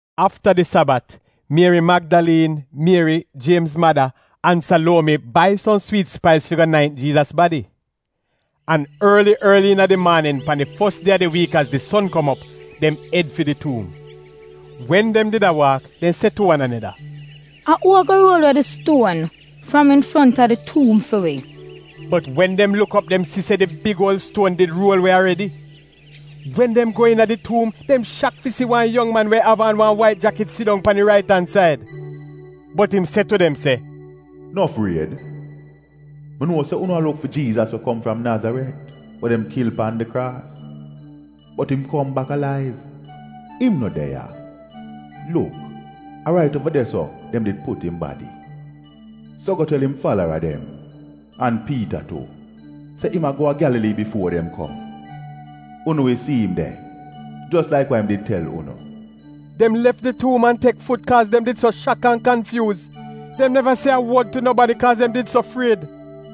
Afta di Sabat, Mieri Magdaliin, Mieri Jiemz mada, an Saluomi bai som swiit spais fi go naint Jiizas badi. An orli orli iina di maanin, pan di fos die a di wiik az di son kom op, dem ed fi di tuum. Wen dem did a waak dem se tu wan aneda, “A uu ago ruol we di stuon fram infronta di tuum fi wi?” Bot wen dem luk op dem si se di big uol stuon di ruol we aredi. Wen dem go iina di tuum, dem shak fi si wan yong man we av aan wan wait jakit sidong pan di rait an said. Bot im se tu dem se, “No fried. Mi nuo se unu a luk fi Jiizas we kom fram Nazaret, we dem kil pan di kraas. Bot im kom bak alaiv. Im no de ya. Luk, a rait uova de-so dem did put im badi. So go tel im falara dem, an Piita tu, se im a go a Gyalalii bifuo dem kom. Unu wi si im de, jos laik wa im did tel unu.” Dem lef di tuum an tek fut, kaaz dem did so shak an kanfyuuz. Dem neva se a wod tu nobadi kaaz dem did so fried.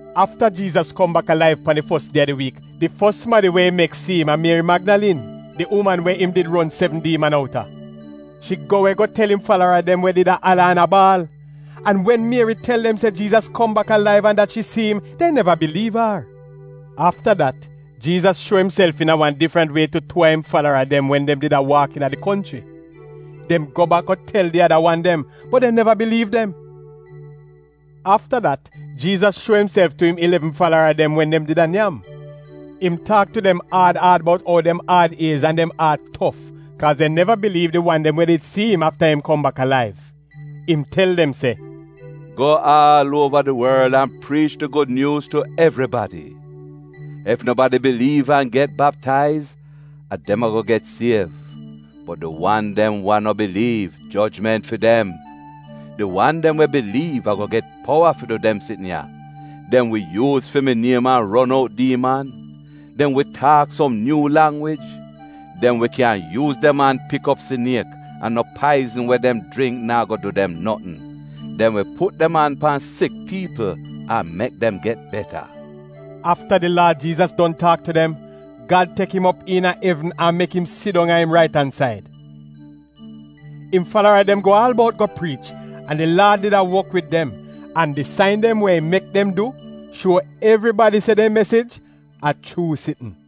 Afta Jiizas kom bak alaiv pan di fos die a di wiik, di fos sumadi we im mek si im a Mieri Magdaliin, di uman we im did ron sevn diiman outa. Shi go we go tel im falara dem we did a ala an a baal. An wen Mieri tel dem se Jiizas kom bak alaiv an dat shi si im, dem neva biliiv ar. Afta dat Jiizas shuo imself iina wa difrant wie tu tuu a im falara dem wen dem did a waak iina di konchri. Dem go bak go tel di ada wan dem, bot dem neva biliiv dem. Afta dat Jiizas shuo imself tu im ilevn falara dem wen dem did a nyam. Im taak tu dem aad aad bout ou dem aad iez an dem aat tof kaaz dem neva biliiv di wan dem we did si im afta im kom bak alaiv. Im tel dem se, “Go aal uova di worl an priich di Gud Nyuuz tu evribadi. Ef nobadi biliiv an get baptaiz, a dem ago get siev, bot di wan dem wa no biliiv, jojment fi dem! Di wan dem we biliiv ago get powa fi du dem sitn ya: dem wi yuuz fi mi niem an ron out diiman, dem wi taak som nyuu langwij, dem wi kyan yuuz dem an pik op siniek, an no paizn we dem jringk naa go du dem notn. Dem wi put dem an pan sik piipl an mek dem get beta.” Afta di Laad Jiizas don taak tu dem, Gad tek im op iina evn an mek im sidong a im rait-an-said. Im falara dem go aal bout go priich, an di Laad did a wok wid dem, an di sain dem we im mek dem du shuo evribadi se dem mesij a chuu sitn.]]